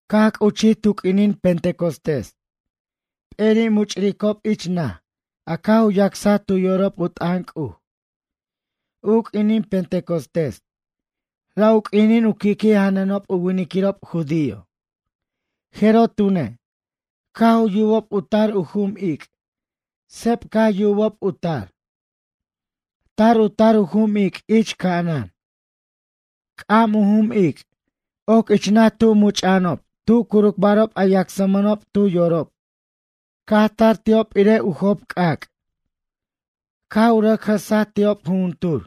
Caj c'uchij tu q'uinin Pentecostés, p'eri' much'ricob ich naj a caj u yacsaj tu yorob u t'ʌn C'uj. U q'uinin Pentecostés, ra' u q'uinin u qui'qui' janʌnob u winiquirob judío. Jeroj tune', caj u yubob u tar u jum ic', seb caj yubob u tar. Tar u tar u jum ic' ich ca'anan. C'am u jum ic' oc ich naj tu much'a'anob tu curucbarob a yacsmʌnob tu yorob. Caj tar ti'ob irej u job c'ac'. Caj u rʌc jʌsaj ti'ob jujuntur,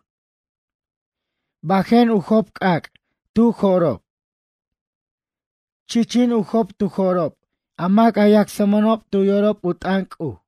bajen u job c'ac' tu jo'rob. Chichin u job tu jo'rob a mac a yacsmʌnob tu yorob u t'ʌn C'uj.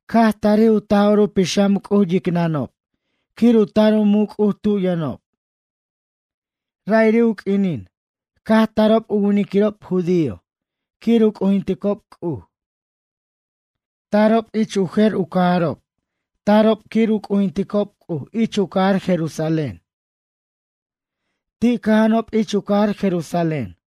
Caj tarij u Taj'or u Pixam C'uj yicnʌob quir u tar u muc' C'uj tu yʌnob. Ra'iri' u q'uinin, caj tarob u winiquirob judío quir u c'ujinticob C'uj. Tarob ich u jer u cajarob tarob quir u c'ujinticob C'uj ich u cajar Jerusalén. Ti' cʌja'anob ich u cajar Jerusalén.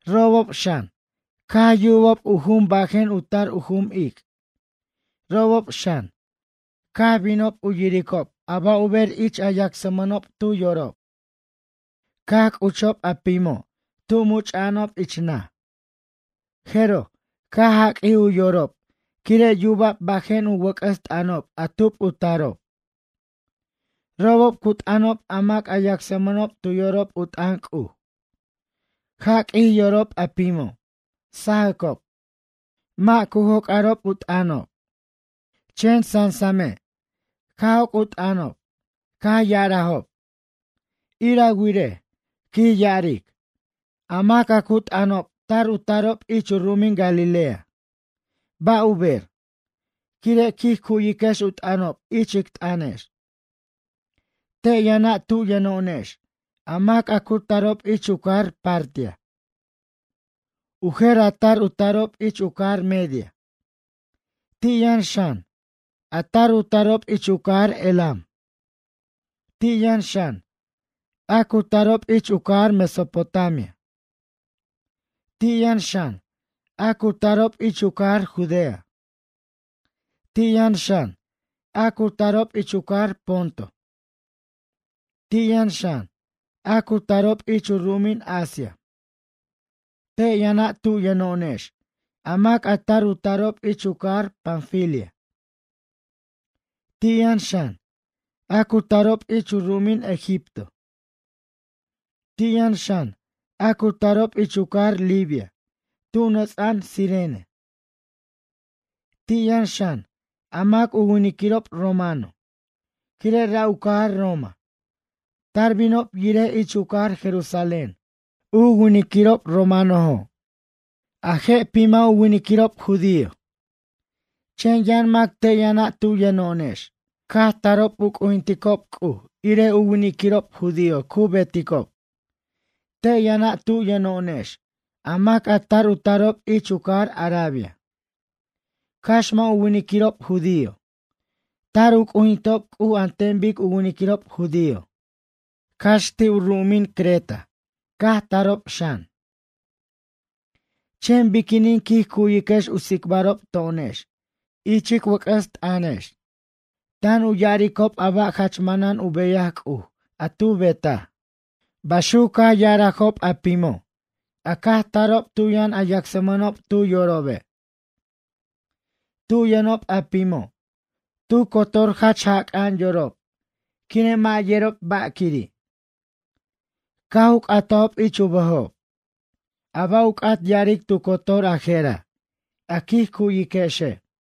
Robob xan, caj yubob u jum bajen u tar u jum ic', robob xan, caj binob u yiricob a ba' u ber ich a yacsmʌnob tu yorob. Caj c'uchob a pimo' tu much'a'anob ich naj. Jeroj, caj jaq'uij u yorob quire' yuba'b bajen u wʌc'ʌs t'ʌnob a tub u tarob. Robob cu t'ʌnob a mac a yacsmʌnob tu yorob u t'ʌn C'uj. Jaq'uij yorob a pimo', sajacob, mʌ' cu joc'arob u t'ʌnob. Chen sasame' caj joc' u t'ʌnob, caj ya'arajob: ―Ir a wirej ―quij ya'aric―. A mac a cu t'ʌnob tar u tarob ich u ru'umin Galilea. Ba' u ber, quire' quij cuyiquex u t'ʌnob ich ic t'ʌnex? Te' yʌna' tu yʌno'onex a mac a cu tarob ich u cajar Partia. U jer a tar u tarob ich u cajar Media. Ti' yʌn xan, a tar u tarob ich u cajar Elam. Ti' yʌn xan, a cu tarob ich u cajar Mesopotamia. Ti' yʌn xan, a cu tarob ich u cajar Judea. Ti' yʌn xan, a cu tarob ich u cajar Ponto. Ti' yʌn xan, a cu tarob ich u ru'umin Asia. Te' yʌna' tu yʌno'onex a mac a tar u tarob ich u cajar Panfilia. Ti' yʌn xan, a cu tarob ich u ru'umin Egipto. Ti' yʌn xan a cu tarob ich u cajar Libia tu nʌts'a'an Cirene. Ti' yʌn xan, a mac u winiquirob romano, quire' ra' u cajar Roma, Tar binob yirej ich u cajar Jerusalén, u winiquirob romanojo'. A je' pima' u winiquirob judío. Chen yʌn mac te' yʌna' tu yʌno'onex caj tarob u c'ujinticob C'uj irej u winiquirob judío cu beticob. Te' yʌna' tu yʌno'onex a mac a tar u tarob ich u cajar Arabia, cax mʌ' u winiquirob judío, tar u c'ujinticob C'uj an ten bic u winiquirob judío, cax ti' u ru'umin Creta caj tarob xan. Chen biquinin quij cuyiquex u tsicbarob to'onex ich ic wʌc'ʌs t'ʌnobex tan u ya'aricob a ba' jach manan u beyaj C'uj a tu betaj? ―baxuc caj ya'arajob a pimo' a caj tarob tu yʌn a yacsmʌnob tu yorobe'. Tu yʌnob a pimo', tu cotor jach jac'a'an yorob quire' mʌ' yerob ba' quiri'. Caj u c'atajob ich u bʌjob: ―A ba' u c'at ya'aric tu cotor a jera', a quij cuyiquexe'?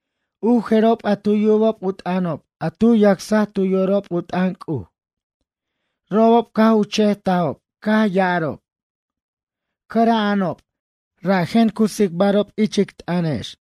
U jerob a tu yubob u t'ʌnob a tu yacsaj tu yorob u t'ʌn C'uj, robob caj u che'tajob caj ya'arob: ―Cʌra'anob, rajen cu tsicbarob ich ic t'ʌnobex.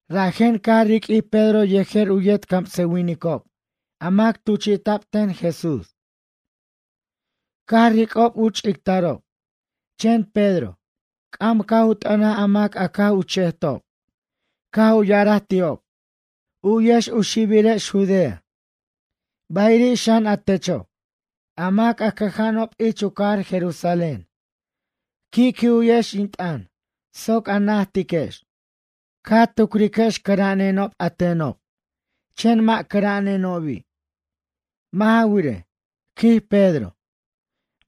Rajen caj riq'uij Pedro yejer u yet camsʌwinicob a mac tuchita'b ten Jesús. Caj ric'ob u ch'ictarob, chen Pedro, c'am caj u t'ʌnaj a mac a caj u che'tob, caj u ya'araj ti'ob: ―U'yex u xibirex Judea, bayiri' xan a techo' a mac a cʌja'anob ich u cajar Jerusalén. Qui'qui' u'yex in t'ʌn soc a najtiquex. Ca tucriquex cʌra'anenob a tenob, chen mʌ' cʌra'anenobi'. Mʌ' ja wirej ―quij Pedro―,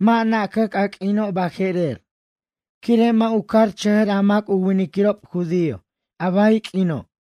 mʌ' nacʌc a q'uino' baje'rer, quire' mʌ' u carchʌjʌr a mac u winiquirob judío a bay q'uino'.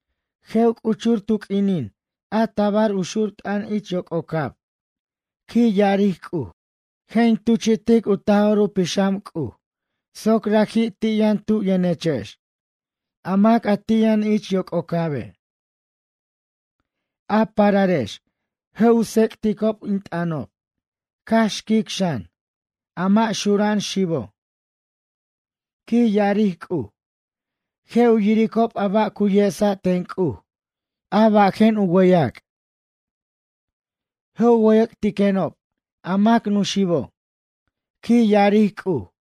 Je' u c'uchur tu q'uinin a tabar u xur t'ʌn ich yoc'ocab, quij ya'aric C'uj. Je' in tuchitic u Taj'or u Pixam C'uj soc raji' ti' yʌn tu' yʌnechex, a mac a ti' yʌn ich yoc'ocabe'. A pararex je' u tsec'ticob in t'ʌnob, cax xquic xan. A mʌ' xura'an xibo', quij ya'aric C'uj, je' u yiricob a ba' cu yesa' ten C'uj a bajen u wʌyʌc'. Je' u wʌyʌc'tiquenob a mac nuxibo', quij ya'aric C'uj.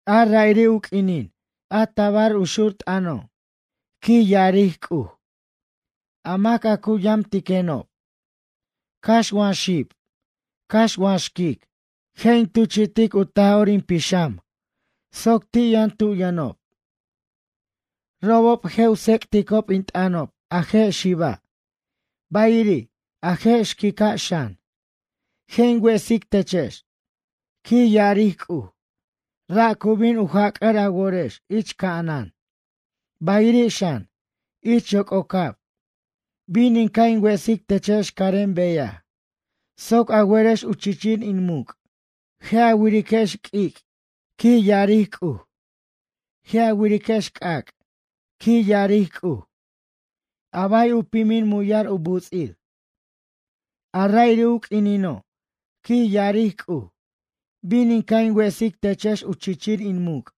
A ra'iri' u q'uinin a tabar u xur t'ʌno', quij ya'aric C'uj, a mac a cu yamtiquenob, cax wa xib, cax wa xquic, Je' in tuchi'tic u Taj'or in Pixam C'uj soc ti' yʌn tu yʌnob. Robob je' u tsec'ticob in t'ʌnob a je' xiba', bayiri', a je' xquica' xan. Je' in wesic techex, quij ya'aric C'uj, ra' cu bin u jac'ar a worex ich ca'anan. Bayiri' xan, ich yoc'ocab bin in ca' in wesic techex carem beyaj soc a werex u chichir in muc'. Je' a wiriquex, quij ya'aric C'uj, q'uic'. Je' a wiriquex c'ac', quij ya'aric C'uj, a bay u pimin muyar u buts'ir. A ra'iri' u q'uinino', quij ya'aric C'uj, bin in ca' in wesic techex u chichir in muc',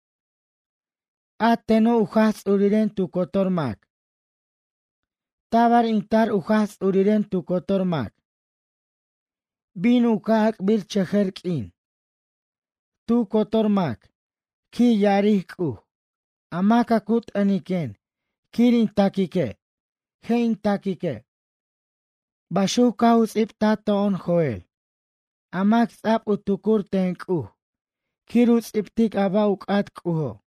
a teno' u Jaj Ts'uriren tu cotor mac. Tabar in tar u Jaj Ts'uriren tu cotor mac. Bin u ca' ac'birchʌjʌr q'uin. Tu cotor mac, quij ya'aric C'uj, a mac a cu t'ʌniquen quir in taquique', je' in taquique'. Baxuc caj u ts'ibtaj to'on Joel, a mac ts'a'b u tucur ten C'uj quir u ts'ibtic a ba' u c'at C'ujo'.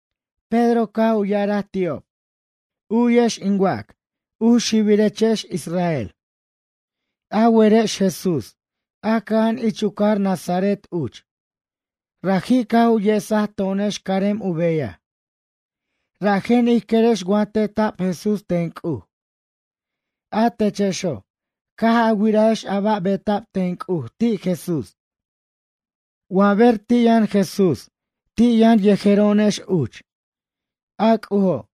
Pedro caj u ya'araj ti'ob: ―U'yex in wac, u xibirechex Israel. A werex Jesús, a cʌja'an ich u cajar Nazaret uch. Raji' caj u yesaj to'onex carem u beyaj, rajen ij querex wa teta'b Jesús ten C'uj. A techexo', caj a wirajex a ba' beta'b ten C'uj ti' Jesús, wa ber ti' yʌn Jesús ti' yʌn yejero'onex uch. A C'ujo',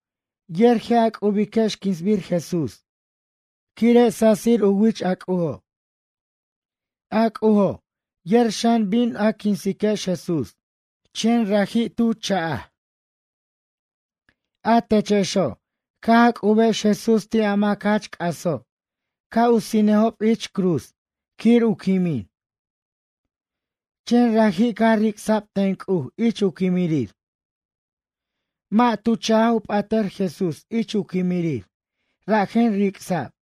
yer je' a c'ubiquex quinsbir Jesús quire' sasir u wich C'ujo'. A C'ujo' yer xan bin a quinsiquex Jesús, chen raji' tu cha'jex. A techexo', caj a c'ubex Jesús ti' a mac jach c'aso' ca' u sinejob ich cruz quir u quimin. Chen raji' caj ric'sa'b ten C'uj ich u quimirir. Mʌ' tu cha'j u p'atʌr Jesús ich u quimirir rajen ric'sa'b.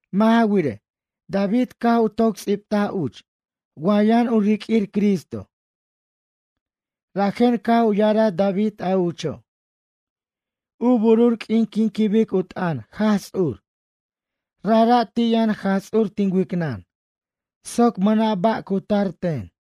Mʌ' ja wirej, David caj u toc ts'ibtaj uch wa yʌn u riq'uir Cristo. Rajen caj u ya'araj David a ucho': U burur q'uin quin quibic u t'ʌn Jaj Ts'ur, rajra' ti' yʌn Jaj Ts'ur tin wicnʌn soc mʌna' ba' cu tar ten.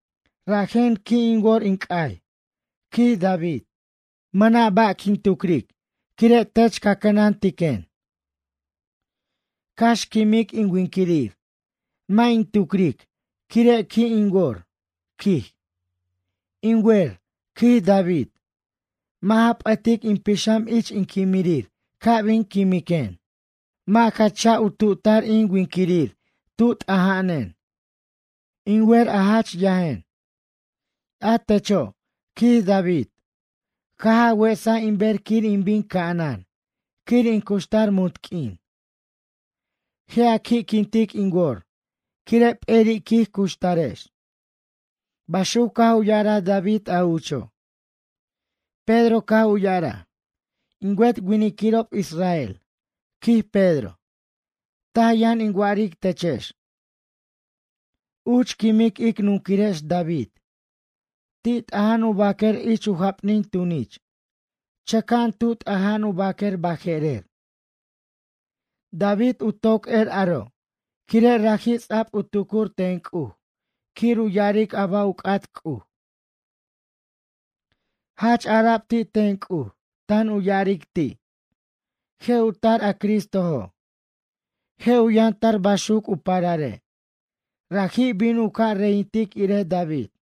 Rajen qui' in wor in c'ay, quij David. Mʌna' ba' quin tucric quire' tech ca cʌnantiquen. Cax quimic in winquirir, mʌ' in tucric quire' qui' in wor, quij. In wer, quij David. Mʌ' ja p'ʌtic in pixam ich in quimirir ca' bin quimiquen. Mʌ' ja cha'j u tu'tar in winquirir tu t'aja'anen. In wer a jach yajen. A techo', quij David, caj a wesaj in ber quir in bin ca'anan quir in cuxtar munt q'uin. Je' a qui'quintic in wor quire' p'eri' quij cuxtarex. Baxuc caj u ya'araj David a ucho'. Pedro caj u ya'araj: ―In wet winiquirob israel ―quij Pedro―. Taj yʌn in wa'aric techex. Uch quimic ic nunquirex David. Ti' t'aja'an u baquer ich u japnin tunich, chʌca'an tu t'aja'an u baquer baje'rer. David u toc er aro' quire' raji' ts'a'b u tucur ten C'uj quir u ya'aric a ba' u c'at C'uj. Jach ara'b ti' ten C'uj tan u ya'aric ti': Je' u tar a Cristojo'. Je' u yʌn tar baxuc u parare'. Raji' bin u ca' reyintic irej David.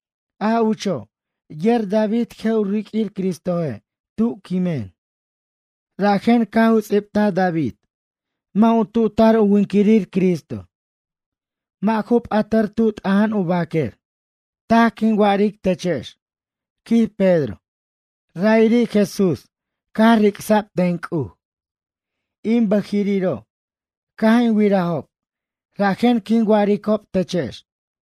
A ucho' yer David je' u riq'uir Cristoje' tu quimen, rajen caj u ts'ibtaj David mʌ' u tu'tar u winquirir Cristo, mʌ' ju p'atʌr tu t'aja'an u baquer. Taj quin wa'aric techex ―quij Pedro―. Ra'iri' Jesús caj ric'sa'b ten C'uj, in bʌjiriro' caj in wirajob rajen quin wa'aricob techex.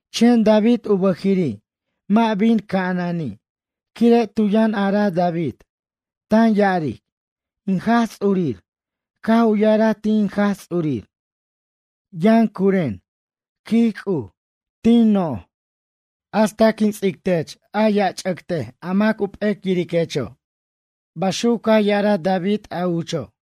Chen David u bʌjiri' mʌ' bin ca'anani' quire' tu yʌn araj David tan ya'aric: In Jaj Ts'urir caj u ya'araj ti' in Jaj Ts'urir: “Yʌn curen, quij C'uj, tin noj, hasta quin ts'ic tech u mosatiquech a mac u p'ec yiriquecho'.” Baxuc caj ara'b ti' David a ucho'.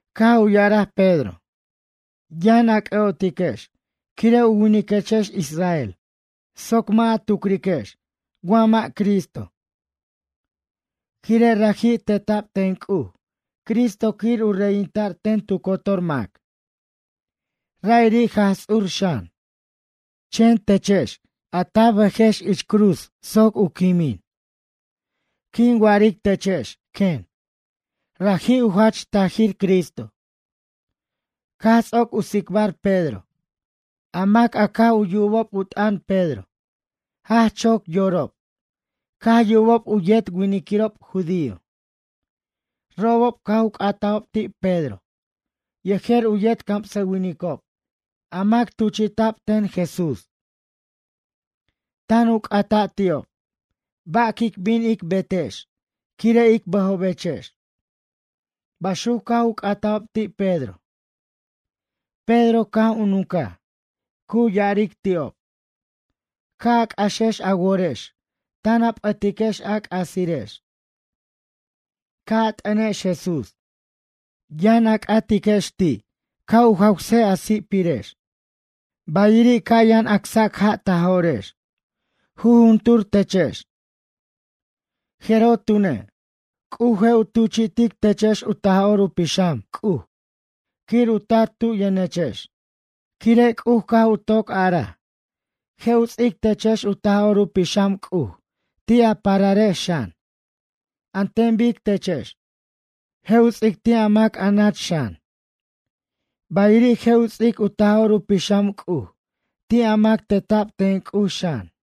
Caj u ya'araj Pedro: ―Yʌn c'ʌ'otiquex quire' u winiquechex israel soc mʌ' a tucriquex wa mʌ' Cristo. Quire' raji' teta'b ten C'uj Cristo quir u reyinta'r ten tu cotor mac. Ra'iri' Jaj Ts'ur xan. Chen techex a ta bʌjex ich cruz soc u quimin. Quin wa'aric techex quen, raji' u jach tajir Cristo. Caj ts'oc u tsicbar Pedro, a mac a caj u yubob u t'ʌn Pedro jach choc yorob caj yubob u yet winiquirob judío. Robob caj u c'atajob ti' Pedro yejer u yet camsʌwinicob a mac tuchi'ta'b ten Jesús. Tan u c'ata' ti'ob: ―Ba' quic bin ic betex quire' ic bʌjobechex? ―baxuc caj u c'atajob ti' Pedro. Pedro caj u nuncaj, cu ya'aric ti'ob: ―Ca' a c'axex a worex tan a p'ʌtiquex a c'asirex. Ca' a t'ʌnex Jesús yʌn c'atiquex ti' ca' u jawsej a si'pirex. Bayiri' ca' yʌn acsac ja' ta jo'rex, jujuntur techex. Jeroj tune', C'uj je' u tuchi'tiquechex u Taj'or u Pixam C'uj quir u tar tu yʌnechex. Quire' C'uj caj u toc araj, je' u ts'ic techex u Taj'or u Pixam C'uj ti' a pararex xan, an ten bic techex. Je' u ts'ic ti' a mac a nach xan. Bayiri', je' u ts'ic u Taj'or u Pixam C'uj ti' a mac teta'b ten C'uj xan.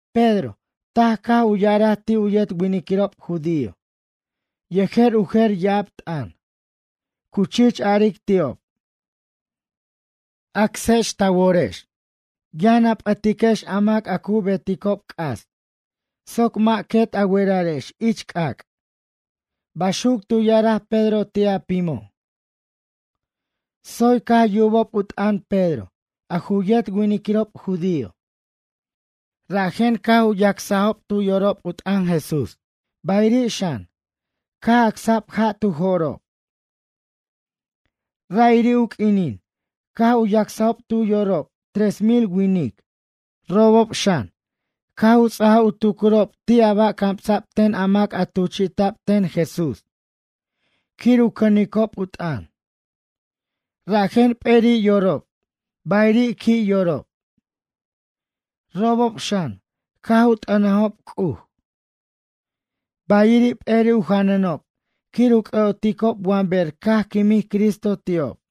Pedro taj caj u ya'araj ti' u yet winiquirob judío yejer u jer ya'ab t'ʌn, cu chich aric ti'ob: ―Ca' a acsex ta worex, yʌn p'ʌtiquex a mac a cu beticob c'as soc mʌ' quet a werarex ich c'ac' ―baxuc tu ya'araj Pedro ti' a pimo'. Tsoy caj yubob u t'ʌn Pedro a ju yet winiquirob judío, rajen caj u yacsajob tu yorob u t'ʌn Jesús bayiri' xan, caj acsa'b ja' tu jo'rob. Ra'iri' u q'uinin caj u yacsajob tu yorob tres mil winic. Robob xan, caj u ts'aj u tucurob ti' a ba' camsa'b ten a mac a tuchi'ta'b ten Jesús quir u cʌnicob u t'ʌn. Rajen p'eri' yorob bayiri' qui' yorob. Robob xan caj u t'ʌnajob C'uj. Bayiri' p'eri' u janʌnob quir u c'ʌ'oticob wa ber caj quimij Cristo ti'ob.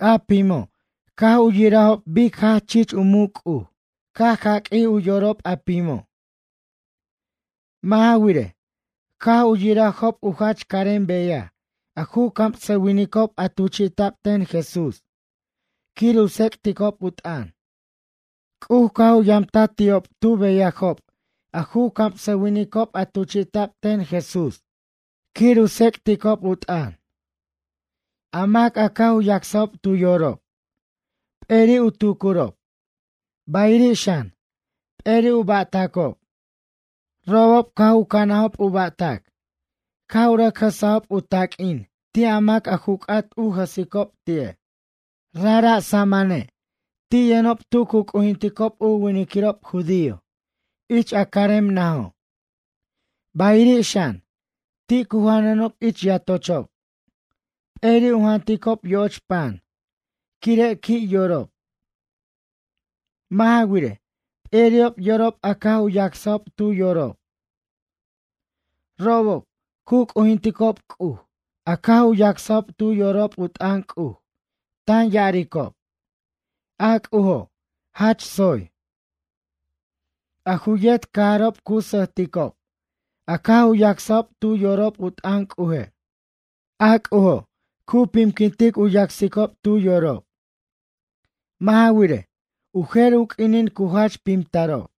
A pimo', caj u yirajob bic jach chich u muc' C'uj caj jaq'uij u yorob a pimo'. Mʌ' ja wirej, caj u yirajob u jach carem beyaj a ju camsʌwinicob a tuchi'ta'b ten Jesús quir u tsec'ticob u t'ʌn. C'uj caj u yamtaj ti'ob tu beyajob a ju camsʌwinicob a tuchi'ta'b ten Jesús quir u tsec'ticob u t'ʌn. A mac a caj u yacsajob tu yorob, p'eri' u tucurob, bayiri' xan, p'eri' u ba'tacob. Robob caj u canajob u ba'tac, caj u rʌc jʌsajob u taq'uin ti' a mac a ju c'at u jʌsicob ti'e'. Rajra' samane' ti' yʌnob tu cu c'ujinticob u winiquirob judío ich a carem najo'. Bayiri' xan, ti' cu janʌnob ich yatochob, p'eri' u janticob yo'och pan quire' qui' yorob. Mʌ' ja wirej, p'eri'ob yorob a caj u yacsajob tu yorob. Robob, cu c'ujinticob C'uj a caj u yacsajob tu yorob u t'ʌn C'uj tan ya'aricob: ―A C'ujo', jach tsoy. A ju yet cajarob cu sʌjticob a caj u yacsajob tu yorob u t'ʌn C'uje'. A C'ujo' cu pimquintic u yacsicob tu yorob. Mʌ' ja wirej, u jer u q'uinin cu jach pimtarob.